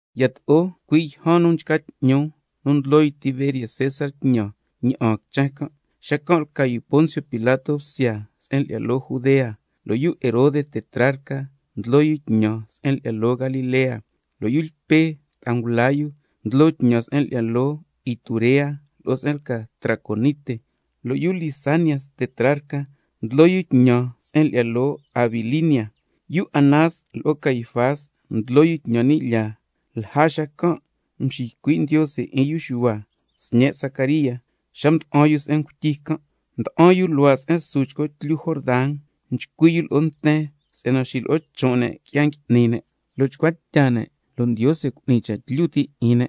Yato'o cui' yjan nu cua' nchca 'tñu nu ndlo yu Tiberio César tñan ña'aan quichen can', xacan' lca yu Poncio Pilato bsya se'en lyi'ya loo Judea, lo' yu Herode tetrarca ndlo tñan se'en lyi'ya loo Galilea, lo' yu Lpe ta'a ngula yu ndlo tñan se'en lyi'ya loo Iturea lo'o se'en lca Traconite, lo' yu Lisanias tetrarca ndlo tñan se'en lyi'ya loo Abilinia. Yu Anás lo'o Caifás ndlo yu tñan ni' lyaa, cui' xacan' mxiycui' Ndiose 'in yu Xuhua, sñe' Zacaría, xa mda'an yu se'en ngutyi can'. Mda'an yu luhua' se'en su chco tlyu Jordan, nchcui' yu lo'o nten si'yana xilo'o chon' ne' qui'ya ngui'ni ne' lo' chcua tya ne', lo' Ndiose cu'ni ñi cha' tlyu ti' 'in ne',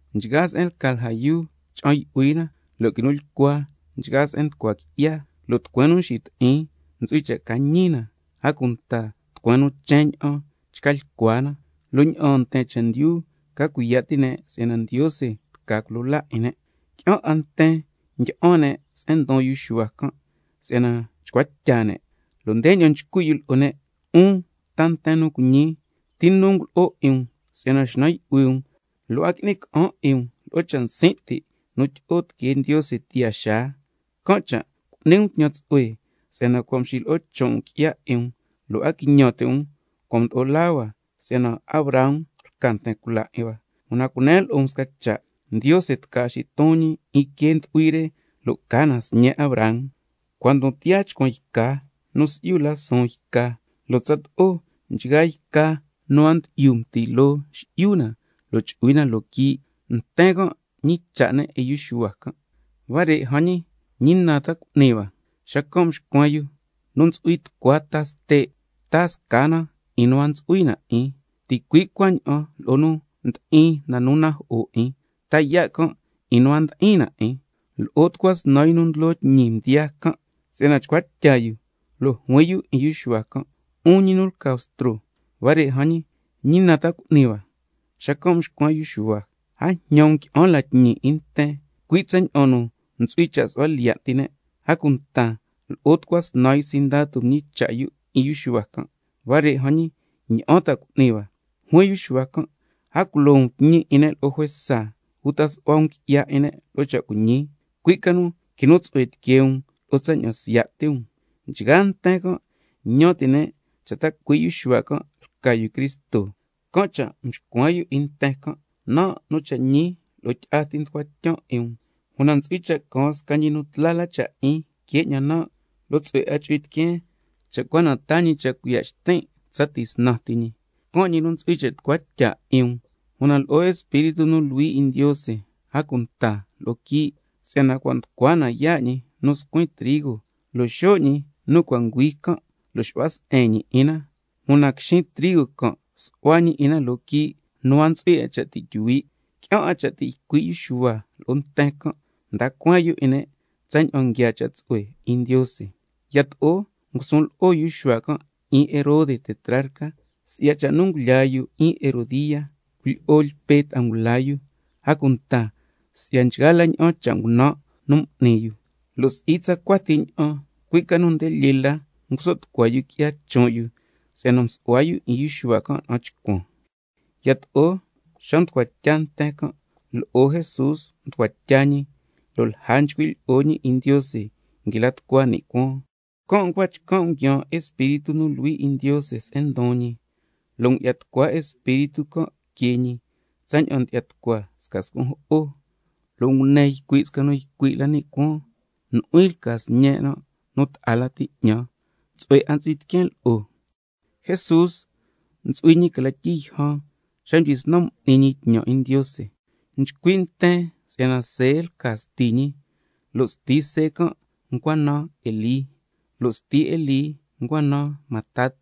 Nchgaa se'en lca lja yuu cha'an yu'hui na, lo' quinu lyicua nchgaa se'en nducua qui'ya, lo' tucueen nu nxiti'in ntsu'hui cha' ca ñi na, a cunta tucueen nu chen ña'an chca lyicua na. Lo' ña'aan nten chendyu ca cuiya' ti' ne' si'yana Ndiose tca culo laa 'in ne'—. Qui'an 'a nten ndyi'an ne' se'en ndon yu Xuhua can' si'yana chcua tya ne', lo' ndeña'an nchcui' yu lo'o ne': 'Un ta nten nu cuiñi, ¿ti nu ngulo'o 'in um si'yana xnan yu'hui um, lo' a qui'ni ca'an 'in um lo'o cha' nsin' ti' nu tyi'o tiquee Ndiose tiyaa xaa? Can' cha' cu'ni um scasca tñan tsu'hue, lo' cuaña'an ca chcan' loo si'yana cua' mxilo'o chon' um qui'ya 'in um, lo' a quiñan ti' um: Cua' mdo'o laa hua si'yana Abraham lca nten cula 'in hua. Una cunen lo'o um sca cha' Ndiose tca xiton ñi quee ndu'hui re lo' ca na sñe' Abraham. A cunta cua' ndon tiyaa chcuan yca nu si'yu la suun yca, can' cha' nchgaa yca nu a ndyi'yu mti loo, xi'yu na lo' chu'hui na loo quii'. Nten can' mñicha' ne' 'in yu Xuhua can': Huare' jan ñi, ¿ñi na ta cu'ni hua? Xacan' mxcuen yu: Nu ntsu'hui tucua ta ste', taa sca na 'in nu a ntsu'hui na 'in, ticui' cuaña'an lo'o nu ndi'in na nu najo'o 'in, ta yaa' can' 'in nu a ndi'in na 'in. Lo'o tucua snan yu nu ndlo tñi mdiyaa can' si'yana chcua tya yu, lo' juin yu 'in yu Xuhua can': 'Un ñi nu lca Bstro, huare' jan ñi, ¿ñi na ta cu'ni hua? Xacan' mxcuen yu Xuhua can': A jñan um qui'an la tñi 'in nten, cui' tsaña'an nu ntsu'hui cha' su'hua lyiya' ti ne'. A cunta lo'o tucua snan yu sindatu mñicha' yu 'in yu Xuhua can': Huare' jan ñi, ¿ña'an ta cu'ni hua? Juin yu Xuhua can': A culo um tñi 'in ne' lo'o juesa, uta su'hua um qui'ya 'in ne' lo'o cha' cuiñi, cui' ca nu quinu tsu'hue tiquee um lo'o tsaña'an siya' ti um. Si'yana nchgaa nten can' ñan ti' ne' cha' ta cui' yu Xuhua can' lca yu Cristo, can' cha' mxcuen yu 'in nten can': Nan' nu cha' ñi lo'o tyi'a ti nducuan tyan 'in um, una ntsu'hui cha' caan sca ñi nu tla la cha' 'in que 'ñan nan', lo' tsu'hue 'a chu'hui tiqueen cha' cua na taa ñi cha' cuiya' xtin' tsa tisnan ti ñi. Can' ñi nu ntsu'hui cha' tucua tya 'in um, una lo'o Espíritu nu Luhui 'in Ndiose, a cunta lo'o quii'. Si'yana cua' nducua na yaa' ñi nu scuin trigo, lo' xo' ñi nu cua' nguhui can' lo' xu'hua se'en ñi 'in na, una quixin trigo can' su'hua ñi 'in na loo quii' nu a ntsu'hui cha' ti' tyuhui'. Qui'an 'a cha' ti' ycui' yu Xuhua lo'o nten can', mda cueen yu 'in ne' tsaña'an nguiaa cha' tsu'hue 'in Ndiose. Yato'o ngusun lo'o yu Xuhua can' 'in Herode tetrarca, si'ya cha' nu ngulyaa yu 'in Herodía, cuilyi'o Lpe ta'a ngula yu, a cunta si'ya nchgaa la ña'an cha' ngunan' nu ngui'ni yu, lo' si'i tsacua ti ña'an, cui' ca nu nde lyee la nguso' tucua yu qui'ya chon' yu si'yana msu'hua yu 'in Xuhua can' na'an chcuan. Yato'o xa nducua tya nten can', lo'o Jesús mducua tya ñi, lo' lja nchcui' lyi'o ñi 'in Ndiose nguila tucua ni' cuaan, can' ncua chcan' nguiaan Espíritu nu Luhui 'in Ndiose se'en ndon ñi, lo' ngu'ya tucua Espíritu can' que ñi tsaña'an ndyi'ya tucua sca scun' jo'o, lo' ngune ycui' sca nu ycui' la ni' cuaan: Nu'huin lca Sñen' nu ta'a lati 'ñan, tsu'hue 'a ntsu'hui tiqueen lo'o. Jesús ntsu'hui ñi cla tyii yjan xa mdyisnan m'ni ñi tñan 'in Ndiose. Nchcui' nten si'yana See lca sti ñi, lo' sti See can' ncua naan Elí, lo' sti Elí ncua naan Matat,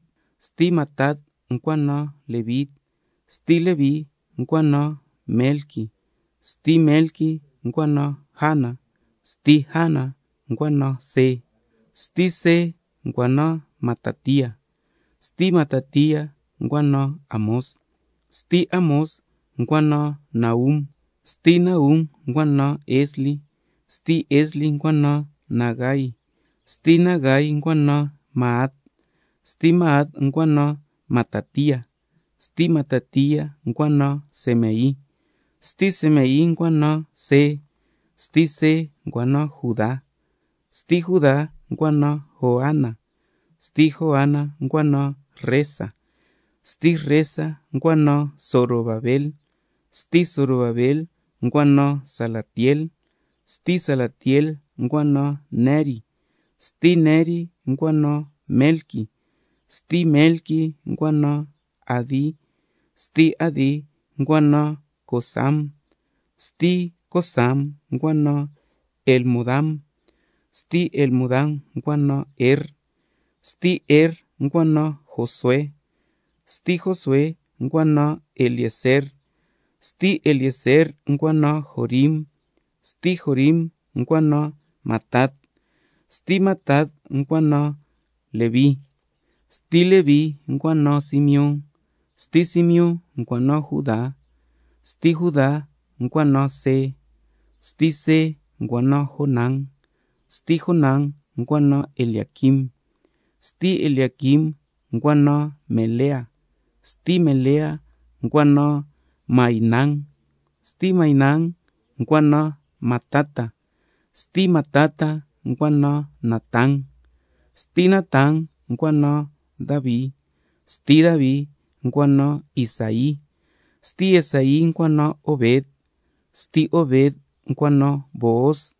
sti Matat ncua naan Leví, sti Leví ncua naan Melqui, sti Melqui ncua naan Jana, sti Jana ncua naan See, sti See ncua naan Matatía, sti Matatía ncua naan Amós, sti Amós ncua naan Nahum, sti Nahum ncua naan Esli, sti Esli ncua naan Nagai, sti Nagai ncua naan Maat, sti Maat ncua naan Matatía, sti Matatía ncua naan Semei, sti Semei ncua naan See, sti See ncua naan Judá, sti Judá ncua naan Joana, sti Joana ncua naan Resa, sti Resa ncua naan Zorobabel, sti Zorobabel ncua naan Salatiel, sti Salatiel ncua naan Neri, sti Neri ncua naan Melqui, sti Melqui ncua naan Adi, sti Adi ncua naan Cosam, sti Cosam ncua naan Elmodam, sti Elmodam ncua naan Er, sti Er ncua naan Josué, sti Josué ncua naan Eliezer, sti Eliezer ncua naan Jorim, sti Jorim ncua naan Matat, sti Matat ncua naan Leví, sti Leví ncua naan Simeón, sti Simeón ncua naan Judá, sti Juda ncua naan See, sti See ncua naan Jonán, sti Jonán ncua naan Eliaquim, sti Eliaquim ncua naan Melea, sti Melea ncua naan Mainán, sti Mainán ncua naan Matata, sti Matata ncua naan Natán, sti Natán ncua naan Davi, sti Davi ncua naan Isaí, sti Isaí ncua naan Obed, sti Obed ncua naan Booz,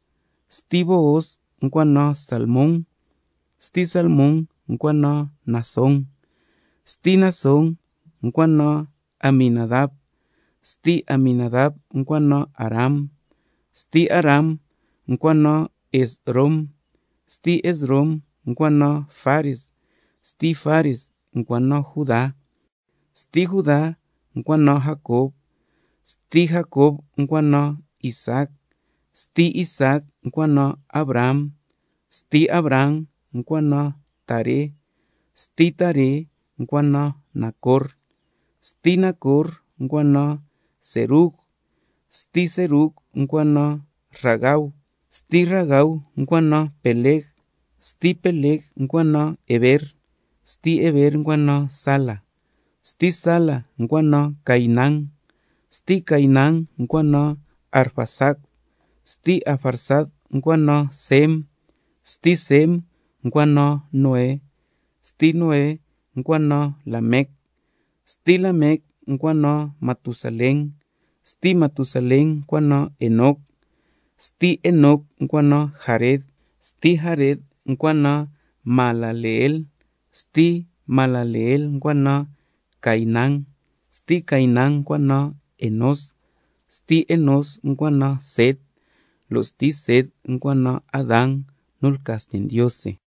sti Booz ncua naan Salmón, sti Salmón ncua naan Naasón, sti Naasón ncua naan Aminadab, sti Aminadab ncua naan Aram, sti Aram ncua naan Esrom, sti Esrom ncua naan Fares, sti Fares ncua naan Judá, sti Judá ncua naan Jacob, sti Jacob ncua naan Isaac, sti Isaac ncua naan Abraham, sti Abraham ncua naan Taré, sti Taré ncua naan Nacor, sti Nacor ncua naan Serug, sti Serug ncua naan Ragau, sti Ragau ncua naan Peleg, sti Peleg ncua naan Heber, sti Heber ncua naan Sala, sti Sala ncua naan Cainán, sti Cainán ncua naan Arfaxad, sti Arfaxad ncua naan Sem, sti Sem ncua naan Noé, sti Noé ncua naan Lamec, sti Lamec ncua naan Matusalén, sti Matusalén ncua naan Enoc, sti Enoc ncua naan Jared, sti Jared ncua naan Mahalaleel, sti Mahalaleel ncua naan Cainán, sti Cainán ncua naan Enós, sti Enós ncua naan Set, lo' sti Set ncua naan Adán nu lca sñe' Ndiose.